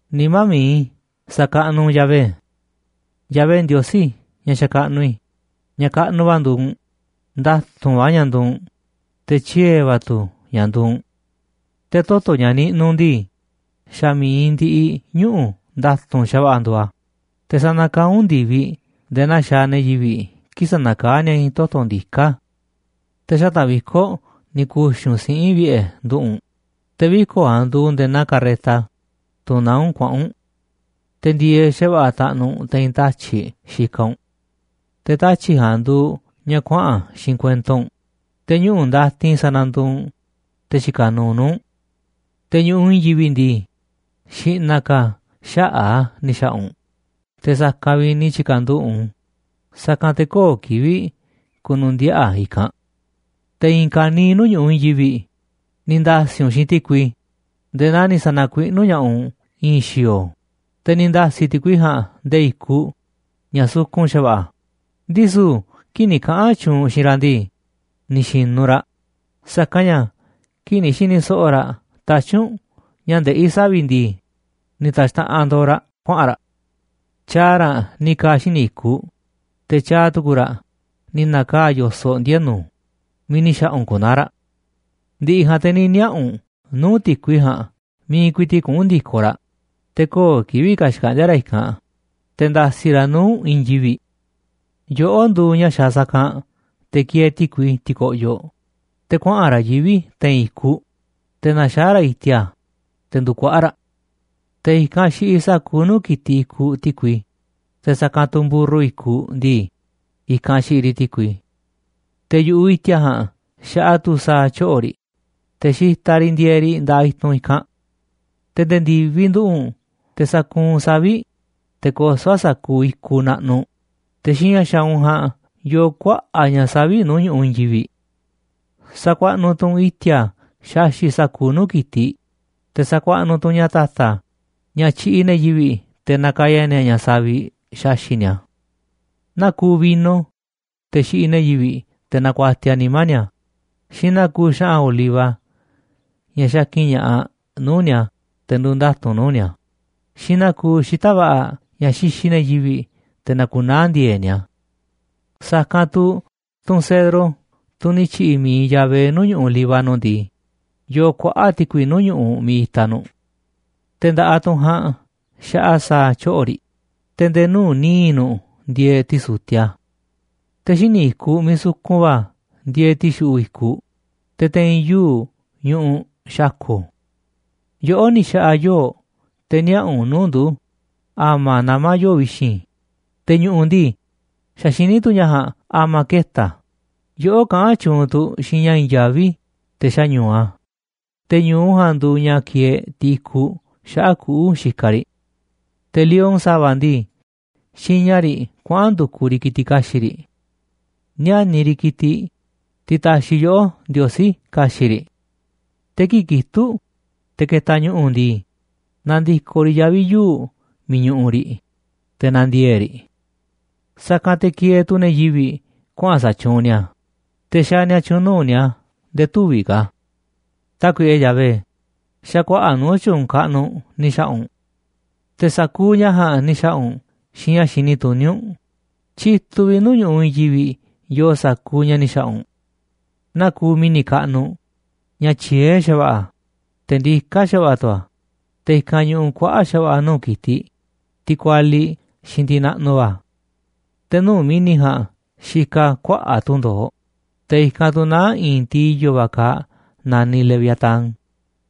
Nimá mi̱iꞌ i̱, sa̱kaꞌnuꞌ u̱nꞌ Yahvé. Yahvé Ndiosí, ña̱ xakaꞌnuꞌ i̱, ña̱ kaꞌnuꞌ va̱ nduuꞌ u̱nꞌ, nda̱tu̱nꞌ va̱ ña̱ nduuꞌ u̱nꞌ, te̱ tyiee̱ va̱ tu̱ ña̱ nduuꞌ u̱nꞌ. Te̱ toto̱ ña̱ niꞌnuꞌ u̱nꞌ ndii, xa̱ mi̱iꞌ ndiꞌiꞌ ñuꞌu̱ nda̱tu̱nꞌ xa̱va̱ꞌa̱ nduuꞌ a̱, te̱ sanakaá u̱nꞌ ndi̱viꞌ nde̱e̱ naa xaaꞌ ne̱ yivi̱ꞌ kii̱ꞌ sanakaá ni̱a̱ i̱i̱n toto̱ ndiká. Te̱ xata̱ꞌ viko̱ꞌ ni̱ ku̱xi̱ u̱nꞌ siꞌi̱n vi̱ꞌe̱ nduꞌu̱ꞌ u̱nꞌ, te̱ viko̱ꞌ ja̱a̱nꞌ nduuꞌ nde̱e̱ naa carreta, tunꞌ naá u̱nꞌ kuaꞌa̱n u̱nꞌ. Te̱ ndi̱e̱eꞌ xa̱va̱ꞌa̱ taꞌnuꞌ u̱nꞌ te̱i̱n tatyi̱ꞌ xikaꞌ u̱nꞌ. Te̱ tatyi̱ꞌ ja̱a̱nꞌ nduuꞌ ña̱ kuaꞌa̱n xiinꞌ kuento u̱nꞌ, te̱ ñuꞌu̱ ndatin sananduuꞌ u̱nꞌ te̱ xikaꞌ nuuꞌ nuu̱ꞌ u̱nꞌ. Te̱ ñu̱ꞌuꞌ i̱i̱n yivi̱ꞌ ndii, xi̱ꞌna̱ ka̱ xaꞌa̱ꞌ a̱ ni̱ xa̱ꞌa̱ u̱nꞌ te̱ sa̱kanꞌ vi̱ꞌ ni̱ tyi̱ka̱nduꞌu̱ꞌ u̱nꞌ u̱n, sa̱kanꞌ te̱ köo̱ꞌ kivi̱ꞌ ku̱nu̱ndiaꞌa̱ a̱ i̱kanꞌ. Te̱ i̱i̱n ka̱niiꞌ nuu̱ꞌ ñu̱ꞌuꞌ i̱i̱n yivi̱ꞌ ni̱ nda̱si̱ u̱nꞌ xiinꞌ ti̱kui nde̱e̱ naa ni̱ sa̱na̱kuiꞌnú ña̱ꞌaꞌ u̱nꞌ i̱i̱n xi̱o̱o̱, te̱ ni̱ nda̱si̱ ti̱kui ja̱a̱nꞌ nde̱e̱ i̱kuꞌ ña̱ sukun xa̱va̱ꞌa̱. Ndisu̱ kii̱ꞌ ni̱ kaꞌa̱n tyuunꞌ u̱nꞌ xiinꞌ raꞌ ndii, ni̱ xi̱nu̱ raꞌ, sa̱kanꞌ ña̱ kii̱ꞌ ni̱ xi̱ni̱ so̱ꞌo̱ raꞌ tatyi̱ꞌ u̱nꞌ ña̱ ndeꞌí savi̱ꞌ ndii, ni̱ ta̱xtaꞌanꞌ ndo̱o̱ raꞌ kuaꞌa̱n raꞌ. Tyaaꞌ raꞌ ni̱ ka̱a̱ xíniꞌ i̱kuꞌ, te̱ tyaaꞌ tukuꞌ raꞌ ni̱ na̱kaa̱ꞌ yo̱soꞌ ndienu̱ miiꞌ ni̱ xa̱ꞌa̱ u̱nꞌ ku̱naa̱ raꞌ. Ndi̱ꞌi̱ ja̱a̱nꞌ te̱ ni̱ niaꞌa̱ u̱nꞌ nuu̱ꞌ ti̱kui ja̱a̱nꞌ miiꞌ ku̱i̱ti̱ꞌ kuꞌu̱n ndi̱koꞌ raꞌ, te̱ köo̱ꞌ kivi̱ꞌ ka̱ xkaꞌndi̱a̱ raꞌ i̱kanꞌ, te̱ nda̱si̱ raꞌ nuu̱ꞌ i̱i̱n yivi̱ꞌ. Yoꞌó nduuꞌ ña̱ xaaꞌ sa̱kanꞌ te̱ kieeꞌ ti̱kui ti̱ko̱ꞌyoꞌ, te̱ kuaꞌa̱n raꞌ yivi̱ꞌ te̱i̱n i̱kuꞌ, te̱ naxaá raꞌ i̱ti̱a̱, te̱ ndukuaꞌa̱ꞌ raꞌ. Te̱ i̱kanꞌ xiꞌiꞌ sa̱kuuꞌ nuu̱ꞌ ki̱tiꞌ i̱kuꞌ ti̱kui, te̱ sa̱kanꞌ mburru i̱kuꞌ ndii, i̱kanꞌ xiꞌiꞌ riꞌ ti̱kui. Te̱ yu̱ꞌuꞌ i̱ti̱a̱ ja̱a̱nꞌ xaꞌa tu̱ sa̱a̱ tyoꞌo̱ riꞌ, te̱ xitaꞌ riꞌ ndieeꞌ riꞌ nda̱ꞌaꞌ i̱tunꞌ i̱kanꞌ. Te̱ nde̱e̱ ndi̱viꞌ nduꞌu̱ꞌ u̱nꞌ te̱ sakuunꞌ u̱nꞌ savi̱ꞌ, te̱ kosó u̱nꞌ sa̱kuuꞌ i̱kuꞌ naꞌnuꞌ, te̱ xiinꞌ ña̱ xaaꞌ u̱nꞌ ja̱a̱nꞌ yoo kuaꞌa̱ꞌ ña̱ savi̱ꞌ nuu̱ꞌ ñu̱ꞌuꞌ i̱i̱n yivi̱ꞌ. Sa̱kuaꞌnuꞌ tu̱ u̱nꞌ i̱ti̱a̱ xaxi̱ꞌ sa̱kuuꞌ nuu̱ꞌ ki̱tiꞌ, te̱ sakuaꞌnuꞌ tu̱ u̱nꞌ ña̱ ta̱ta̱ ña̱ tyiꞌiꞌ ne̱ yivi̱ꞌ te̱ nakaya ni̱a̱ ña̱ savi̱ꞌ xaxi̱ꞌ ni̱a̱. Naa kuuꞌ vino, teꞌ xiꞌiꞌ ne̱ yivi̱ꞌ te̱ nakuatiaꞌ nimá ni̱a̱, xiinꞌ naa kuuꞌ xa̱ꞌa̱n oliva, ña̱ xakin ña̱ꞌaꞌ nuu̱ꞌ ni̱a̱ te̱ nduuꞌ nda̱tu̱nꞌ nuu̱ꞌ ni̱a̱, xiinꞌ naa kuuꞌ xita̱ꞌ va̱ꞌa̱, ña̱ xixiꞌ ne̱ yivi̱ꞌ te̱ nakunaá ndi̱e̱e̱ꞌ ni̱a̱. Sa̱kanꞌ tu̱ tunꞌ cedro, tunꞌ ni̱ tyi̱ꞌi̱ mi̱iꞌ Yahvé nuu̱ꞌ ñu̱ꞌuꞌ Líbano ndii, yoo kuaꞌa̱ꞌ ti̱kui nuu̱ꞌ ñu̱ꞌuꞌ miiꞌ itaꞌ nu̱ꞌ. Te̱ nda̱ꞌaꞌ tunꞌ ja̱a̱nꞌ xaꞌa sa̱a̱ tyoꞌo̱ riꞌ, te̱ nde̱e̱ nuu̱ꞌ níiꞌ nu̱ꞌ ndieeꞌ ti̱su̱tiaꞌ. Te̱ xíniꞌ i̱kuꞌ miiꞌ sukun va̱ ndieeꞌ ti̱xuꞌu̱ꞌ i̱kuꞌ, te̱ te̱i̱n yuu̱ꞌ ñuꞌuꞌ xa̱ko̱. Yoꞌó ni̱ xa̱ꞌa̱ yoo̱ꞌ te̱ niaꞌa̱ a̱ nuu̱ꞌ ndu̱ a̱ma̱ namá yoo̱ꞌ vi̱xi̱n, te̱ ñu̱ꞌu̱ ndii, xa̱ xiní tu̱ ña̱ ja̱a̱nꞌ a̱ma̱ keta̱ a̱. Yoꞌó kaꞌán tyuunꞌ tu̱ xiinꞌ ña̱ i̱i̱n yaví te̱ xáñu̱u a̱, te̱ ñu̱u ja̱a̱nꞌ nduuꞌ ña̱ kieeꞌ tiꞌ i̱kuꞌ xaꞌa̱ꞌ kuꞌu̱ xikaꞌ riꞌ. Te̱ lion sa̱va̱ ndii, xiña riꞌ kuaꞌa̱n ndu̱kuꞌ riꞌ ki̱tiꞌ ka̱xi̱ꞌ riꞌ, níániꞌ riꞌ ki̱tiꞌ, tiꞌ ta̱xi̱ yoꞌó, Ndiosí, ka̱xi̱ꞌ riꞌ. Te̱ kii̱ꞌ kitúꞌ, te̱ ketaꞌ ñu̱ꞌu̱ ndii, nandikoꞌ riꞌ yavi̱ yuu̱ꞌ miiꞌ ñuꞌuꞌ riꞌ, te̱ na̱ndiee̱ꞌ riꞌ. Sa̱kanꞌ te̱ kieeꞌ tu̱ ne̱ yivi̱ꞌ kuaꞌa̱n sa̱tyuunꞌ ni̱a̱, te̱ xaaꞌ ni̱a̱ tyu̱u̱n nuu̱ꞌ ni̱a̱ nde̱e̱ tüviꞌ ka̱. Tákuiꞌe Yahvé, xa̱ kuaꞌa̱ꞌ nuu̱ꞌ tyu̱u̱n kaꞌnuꞌ ni̱ xa̱ꞌa̱ u̱nꞌ, te̱ sa̱kuuꞌ ña̱ ja̱a̱nꞌ ni̱ xa̱ꞌa̱ u̱nꞌ xiinꞌ ña̱ xini tuní u̱nꞌ, tyituꞌ vi̱ꞌ nuu̱ꞌ ñu̱ꞌuꞌ i̱i̱n yivi̱ꞌ yoo sa̱kuuꞌ ña̱ ni̱ xa̱ꞌa̱ u̱nꞌ. Naa kuuꞌ mi̱ni̱ kaꞌnuꞌ, ña̱ tyiee̱ xa̱va̱ꞌa̱, te̱ ndiká xa̱va̱ꞌa̱ tu̱ a̱, te̱ i̱kanꞌ ñuꞌuꞌ kuaꞌa̱ꞌ xa̱va̱ꞌa̱ nuu̱ꞌ ki̱tiꞌ, tiꞌ kualiꞌ xiinꞌ tiꞌ naꞌnuꞌ va̱. Te̱ nuu̱ꞌ mi̱ni̱ ja̱a̱nꞌ xikaꞌ kuaꞌa̱ꞌ tundo̱oꞌ, te̱ i̱kanꞌ tu̱ naá i̱i̱n tiꞌ i̱yo̱ va̱ kaaꞌ naniꞌ leviatán,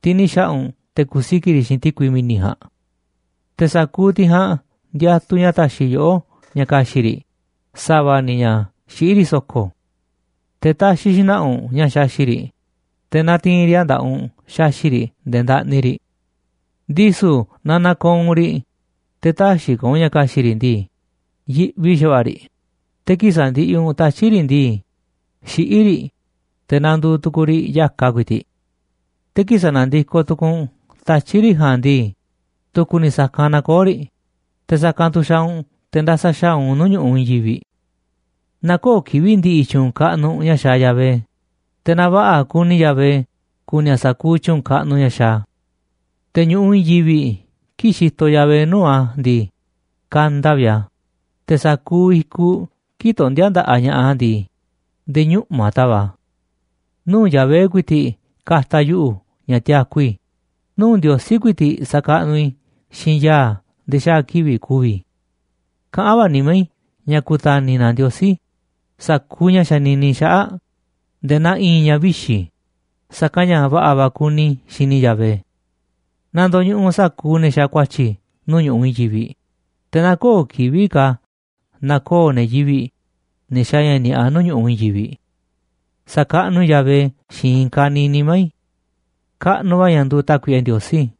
tiꞌ ni̱ xa̱ꞌa̱ u̱nꞌ te̱ ku̱siki̱ꞌ riꞌ xiinꞌ ti̱kui mi̱ni̱ ja̱a̱nꞌ. Te̱ sa̱kuuꞌ tiꞌ ja̱a̱nꞌ ndiatuꞌ ña̱ ta̱xi̱ yoꞌó ña̱ ka̱xi̱ꞌ riꞌ sa̱va̱ ni̱ ña̱ xiꞌí riꞌ so̱ko̱. Te̱ taxiꞌ xna̱ꞌa̱ u̱nꞌ ña̱ xaxi̱ꞌ riꞌ, te̱ natiinꞌ riꞌ a̱ nda̱ꞌaꞌ u̱nꞌ xaxi̱ꞌ riꞌ nde̱e̱ ndaꞌni riꞌ. Ndisu̱ naaꞌ na̱ko̱o̱ u̱nꞌ riꞌ, te̱ tä̱xi̱ ka̱ u̱nꞌ ña̱ ka̱xi̱ꞌ riꞌ ndii, yiꞌvi xa̱va̱ꞌa̱ riꞌ, te̱ kii̱ꞌ sandiꞌiꞌ u̱nꞌ tatyi̱ꞌ riꞌ ndii, xiꞌí riꞌ, te̱ nanduuꞌ tukuuꞌ riꞌ ya̱kaꞌ ku̱i̱ti̱ꞌ. Te̱ kii̱ꞌ sanadiko tukuuꞌ u̱nꞌ tatyi̱ꞌ riꞌ ja̱a̱nꞌ ndii, tu̱ku̱ ni̱ sa̱kanꞌ nakoó riꞌ, te̱ sa̱kanꞌ tu̱ xaaꞌ u̱nꞌ te̱ ndasa xa̱aꞌ u̱nꞌ nuu̱ꞌ ñu̱ꞌuꞌ i̱i̱n yivi̱ꞌ. Na kö̱o̱ kivi̱ꞌ ndi̱ꞌi̱ tyu̱u̱n kaꞌnuꞌ ña̱ xaaꞌ Yahvé, te̱ na va̱ꞌa̱ kuni Yahvé ku̱ni̱ a̱ sa̱kuuꞌ tyu̱u̱n kaꞌnuꞌ ña̱ xaaꞌ a̱. Te̱ ñu̱ꞌuꞌ i̱i̱n yivi̱ꞌ kii̱ꞌ xitoꞌ Yahvé nuu̱ꞌ a̱ ndii, kanda vi̱ꞌ a̱, te̱ sa̱kuuꞌ i̱kuꞌ kii̱ꞌ tondíá nda̱ꞌaꞌ ña̱ꞌaꞌ a̱ ndii, nde̱e̱ ñuꞌma̱ tava̱ꞌ a̱. Nuu̱ꞌ Yahvé ku̱i̱ti̱ꞌ ka̱ta̱ yuꞌu̱ ña̱ tiaku i̱, nuu̱ꞌ Ndiosí ku̱i̱ti̱ꞌ sa̱kaꞌnuꞌ i̱ xiinꞌ ya̱a̱ nde̱e̱ xaa̱ kivi̱ꞌ ku̱vi̱ i̱. Kaꞌán va̱ nimá i̱ ña̱ ku̱ta̱ni̱ na Ndiosí sa̱kuuꞌ ña̱ xanini i̱ xaꞌa̱ꞌ nde̱e̱ naa i̱i̱n ña̱ vixi̱, sa̱kanꞌ ña̱ va̱ꞌa̱ va̱ kuni i̱ xini Yahvé. Na ndo̱ñuꞌuꞌ sa̱kuuꞌ ne̱ xaaꞌ ku̱a̱tyi̱ nuu̱ꞌ ñu̱ꞌuꞌ i̱i̱n yivi̱ꞌ, te̱ na köo̱ꞌ kivi̱ꞌ ka̱ na̱koo̱ ne̱ yivi̱ꞌ, ne̱ xaaꞌ ña̱ ni̱a̱ꞌa nuu̱ꞌ ñu̱ꞌuꞌ i̱i̱n yivi̱ꞌ. Sa̱kaꞌnuꞌ i̱ Yahvé xiinꞌ i̱i̱n ka̱niiꞌ nimá i̱. Kaꞌnuꞌ va̱ ña̱ nduuꞌ Tákuiꞌe Ndiosí.